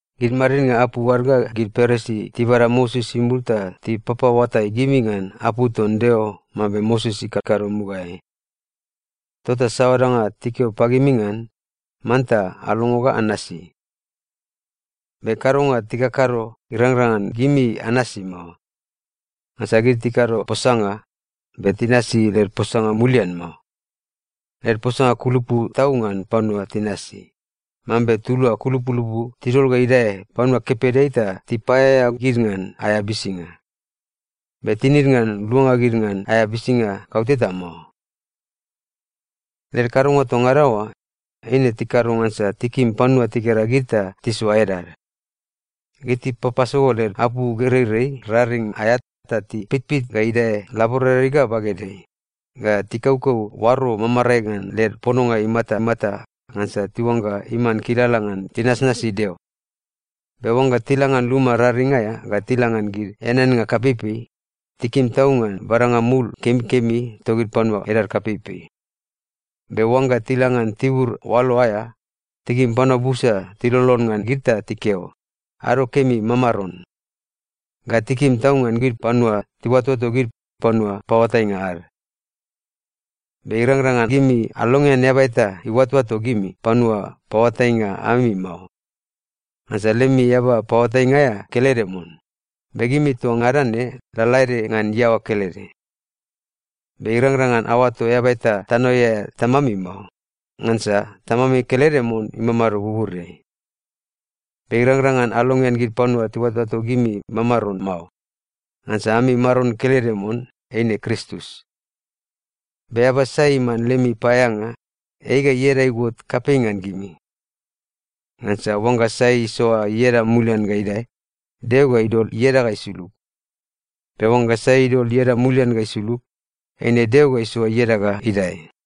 “Gid madidnga apu ad ga gid Parisi tibada Moses imul ta tipapaoatai gimi ngan apu ton Deo mambe Moses ikakado mugaeai. Tota saoa danga tikeo pagimi ngan, manta alongo ga anasi. Be kadonga tikakado, irangrang ngan gimi anasi mao. Ngansa gid tikado posanga, be tinasi led posanga mulian mao. Led posanga kulupu tau ngan panua tinasi, mambe tulua kulupulupu tidol ga idae panua kepedeai ta tipaeaea gid ngan aea bisinga. Be tinid ngan luanga gid ngan aea bisinga kauteta mao. “Led kadonga toa ngada oa, eine tikado ngansa tikim panua tigera gid ta tisoa edad. Gid tipapasogo led apou gereirei raring aea ta tipitpit ga idae laboradeai ga bagedeai, ga tikaukau oaro mamamarae ngan led pononga imatamata ngansa tiuangga iman kilala ngan tinasnasi Deo. Be oangga tila ngan luma raring aea ga tila ngan gid eaneannga kapeipei, tikim tau ngan badanga mul kemikemi togid panua edad kapeipei. Be oangga tila ngan tibur oalo aea, tikim panua busa tilolon ngan gid ta tikeo, ‘Ado kemi, mamaron.’ Ga tikim tau ngan gid panua tiuatoato gid ‘panua paoatainga ad.’ “Be irangrang ngan gimi alongean eaba eta iuatoato gimi ‘panua paoatainga ami’ mao. Ngansa lemi eaba paoatainga aea kelede mon, be gimi toa ngada ne lalaede ngan iaoa kelede. Be irangrang ngan aoato eaba eta tanoeai aea ‘tamami’ mao. Ngansa Tamami kelede mon imamado buburiai. Be irangrang ngan alongean gid panua tiuatoato gimi ‘mamaron’ mao, ngansa ami Maron kelede mon, eine Kristus. Be eaba sai iman lemi paeaeanga, ei ga ieda iuot kapei ngan gimi. Ngansa oangga sai isoa ieda mulian ga idae, Deo ga idol ieda ga isulug. Be oangga sai idol ieda mulian ga isulug, eine Deo ga isoa ieda ga idae.”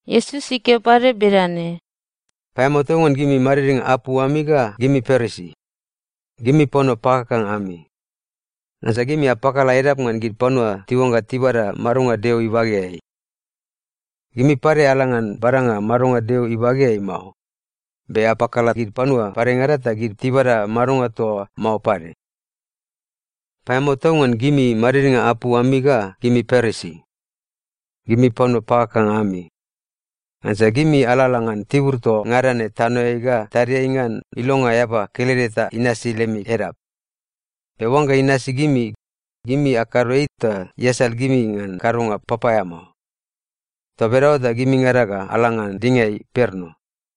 Iesus ikeo pade bedane, “Paeamao tau ngan gimi madidnga apu ami ga gimi Parisi! Gimi panua pakakanga ami! Ngansa gimi apakala edap ngan gid panua tiuangga tibada madonga Deo ibageai. Gimi pade ala ngan badanga madonga Deo ibageai mao, be apakala gid panua padengada ta gid tibada madonga toa oa mao pade. “Paeamao tau ngan gimi madidnga apu ami ga gimi Parisi! Gimi panua pakakanga ami! Ngansa gimi alalala ngan tibur toa ngada ne tanoeai ga tadiai ngan ilonga eaba kelede ta inasi lemi edap. Be oangga inasi gimi, gimi akado ei ta iasal gimi ngan kadonga papaeamao. Toa bedaoa ta gimingada ga ala ngan dinga imperno.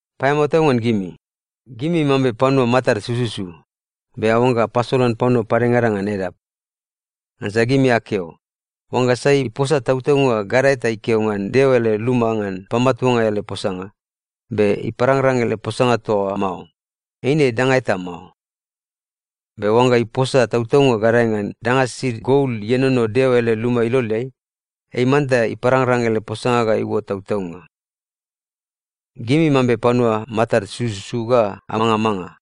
“Paeamao tau ngan gimi! Gimi mambe panua matad sususu, be aoangga apasolan panua padengada ngan edap. Ngansa gimi akeo, ‘Oangga sai iposa tautaunga gadae ta ikeo ngan Deo ele luma ngan pamatuanga ele posanga, be iparangrang ele posanga toa oa mao, eine danga eta mao. Be oangga iposa tautaunga gadae ngan danga sisid gol ienono Deo ele luma iloleai, ei manta iparangrang ele posanga ga iuot tautaunga.’ Gimi mambe panua matad sususu ga amangamanga!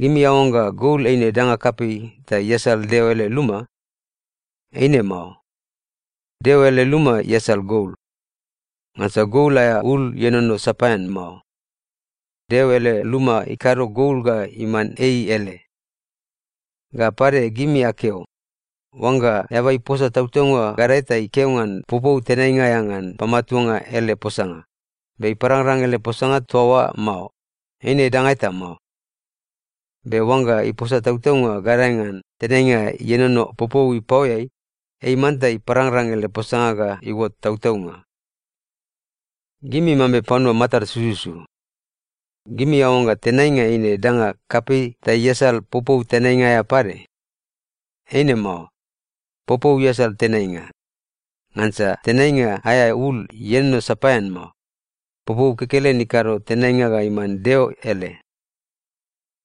Gimi aoangga gol eine danga kapei ta iasal Deo ele luma? Eine mao. Deo ele luma iasal gol. Ngansa gol aea ul ienono sapaean mao. Deo ele luma ikado gol ga iman ei ele. Ga pade, gimi akeo, ‘Oangga eaba iposa tautaunga gadae ta ikeo ngan popou tenainga aea ngan pamatuanga ele posanga, be iparangrang ele posanga toa oa mao, eine danga eta mao. Be oangga iposa tautaunga gadae ngan tenainga ienono popou ipaoeai, ei manta iparangrang ele posanga ga iuot tautaunga.’ Gimi mambe panua matad sususu! Gimi aoangga tenainga eine danga kapei ta iasal popou tenainga aea pade? Eine mao. Popou iasal tenainga. Ngansa tenainga aea ul ienono sapaean mao. Popou kekelen ikado tenainga ga iman Deo ele.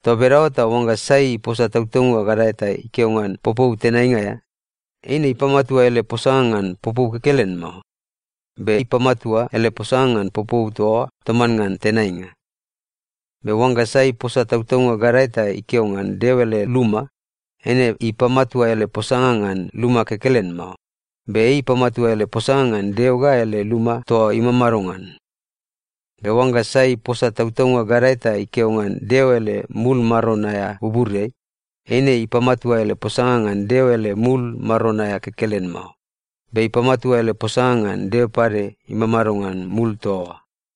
Toa bedaoa ta oangga sai iposa tautaunga gadae ta ikeo ngan popou tenainga aea, eine ipamatua ele posanga ngan popou kekelen mao, be ipamatua ele posanga ngan popou toa oa toman ngan tenainga. Be oangga sai iposa tautaunga gadae ta ikeo ngan Deo ele luma, eine ipamatua ele posanga ngan luma kekelen mao, be ipamatua ele posanga ngan Deo ga ele luma toa imamado ngan. Be oangga sai iposa tautaunga gadae ta ikeo ngan Deo ele mul Maron aea buburiai, eine ipamatua ele posanga ngan Deo ele mul Maron aea kekelen mao, be ipamatua ele posanga ngan Deo pade imamado ngan mul toa oa.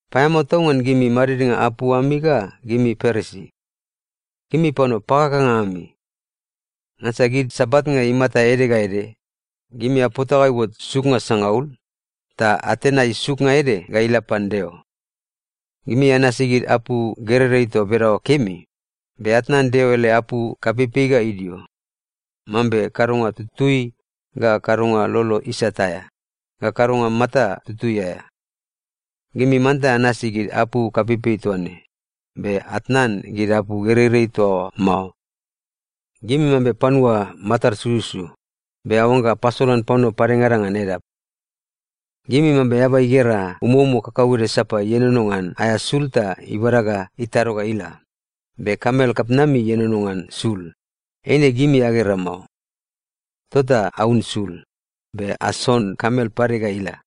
“Paeamao tau ngan gimi madidnga apu ami ga gimi Parisi! Gimi panua pakakanga ami! Ngansa gid sabatnga imata ede ga ede, gimi apota ga iuot suknga sangaul, ta atenai suknga ede ga ila pan Deo. Gimi anasi gid apu gereirei toa bedaoa kemi, be atnan Deo ele apu kapeipei ga idio, mambe kadonga tutui, ga kadonga lolo isat aea, ga kadonga mata tutui aea. Gimi manta anasi gid apu kapeipei toa ne, be atnan gid apu gereirei toa oa mao. Gimi mambe panua matad sususu, be aoangga apasolan panua padengada ngan edap. Gimi mambe eaba igera umoumo kakauede sapa ienono ngan aea sul ta ibada ga itado ga ila, be kamel kapitnami ienono ngan sul, eine gimi agera mao. Tota aun sul, be ason kamel pade ga ila.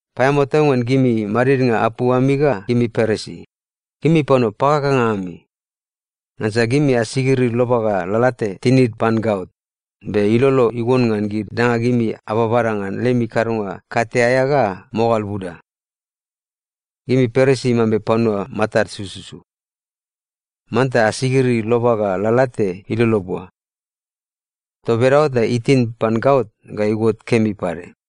“Paeamao tau ngan gimi madidnga apu ami ga gimi Parisi! Gimi panua pakakanga ami! Ngansa gimi asigiri loba ga lalate tinid pan gaot, be ilolo iuon ngan gid danga gimi ababada ngan lemi kadonga kate aea ga mogal buda. Gimi Parisi mambe panua matad sususu. Manta asigiri loba ga lalate ilolo bua. Toa bedaoa ta itin pan gaot ga iuot kemi pade.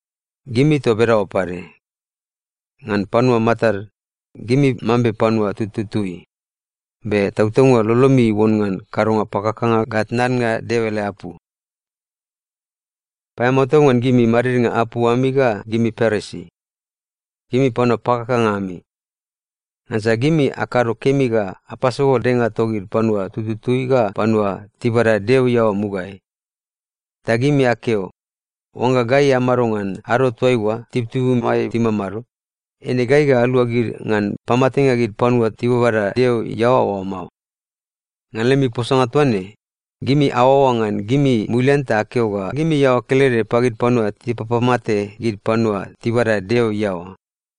Gimi toa bedaoa pade. Ngan panua matad, gimi mambe panua tututui, be tautaunga lolomi iuon ngan kadonga pakakanga ga tnannga Deo ele apu. “Paeamao tau ngan gimi madidnga apu ami ga gimi Parisi! Gimi panua pakakanga ami! Ngansa gimi akado kemi ga apasogo denga togid panua tututui ga panua tibada Deo iaoa mugaeai. Ta gimi akeo, ‘Oangga gai amado ngan ado toaiua tibutibumai timamado, eine gai ga alua gid ngan pamatenga gid panua tibabada Deo iaoa oa mao.’ Ngan lemi posanga toa ne, gimi aoaoa ngan gimi mulian ta akeo ga gimi iaoa kelede pagid panua tipapamate gid panua tibada Deo iaoa.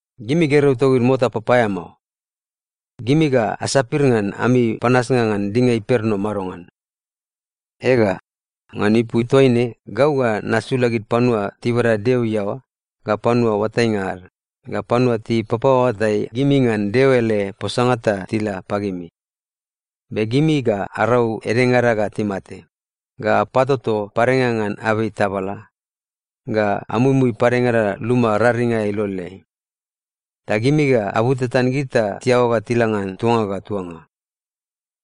“Gimi gergeu togid mota papaeamao! Gimi ga asapir ngan ami panasnga ngan dinga imperno madongan? Ega, ngan ipu toaine gau ga nasula gid panua tibada Deo iaoa, ga panua oatainga ad, ga panua tipapaoatai gimi ngan Deo ele posanga ta tila pagimi. Be gimi ga arau edengada ga timate, ga apatoto padengada ngan abei tabala, ga amuimui padengada luma raring aea iloleai. Ta gimi ga abutatan gid ta tiaoa ga tila ngan tuanga ga tuanga.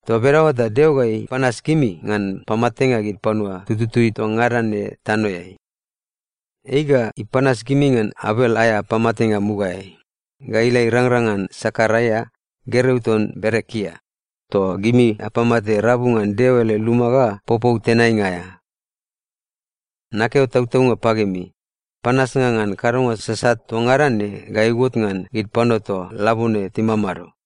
Toa bedaoa ta Deo ga ipanas gimi ngan pamatenga gid panua tututui toa ngada ne tanoeai. Ei ga ipanas gimi ngan Abel aea pamatenga mugaeai, ga ila irangrang ngan Sekaraia, gergeu ton Berekia, toa gimi apamate rabu ngan Deo ele luma ga popou tenainga aea. Nakeo tautaunga pagimi, panasnga ngan kadonga sasat toa ngada ne ga iuot ngan gid panua toa labone timamado.”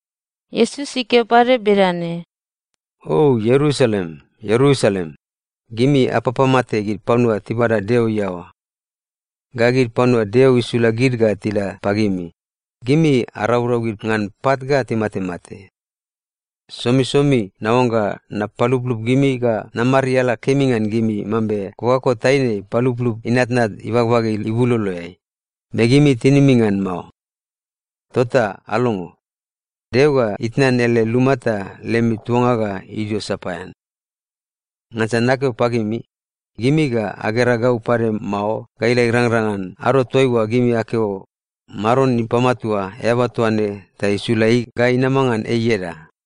Iesus ikeo pade bedane, “O Ierusalem, Ierusalem, gimi apapamate gid panua tibada Deo iaoa. Ga gid panua Deo isula gid ga tila pagimi, gimi araurau gid ngan pat ga timatemate. Somisomi naoangga napaluplup gimi ga namariala kemi ngan gimi mambe kokako taine ipaluplup inatnat ibagbage ibuloloeai, be gimi tinimi ngan mao. Tota alongo. Deo ga itnan ele luma ta lemi tuanga ga idio sapaean. Ngansa nakeo pagimi, gimi ga agera gau pade mao ga ila irangrang ngan ado toaiua gimi akeo, ‘Maron ipamatua eaba toa ne ta isula ei ga inama ngan ei ieda.’”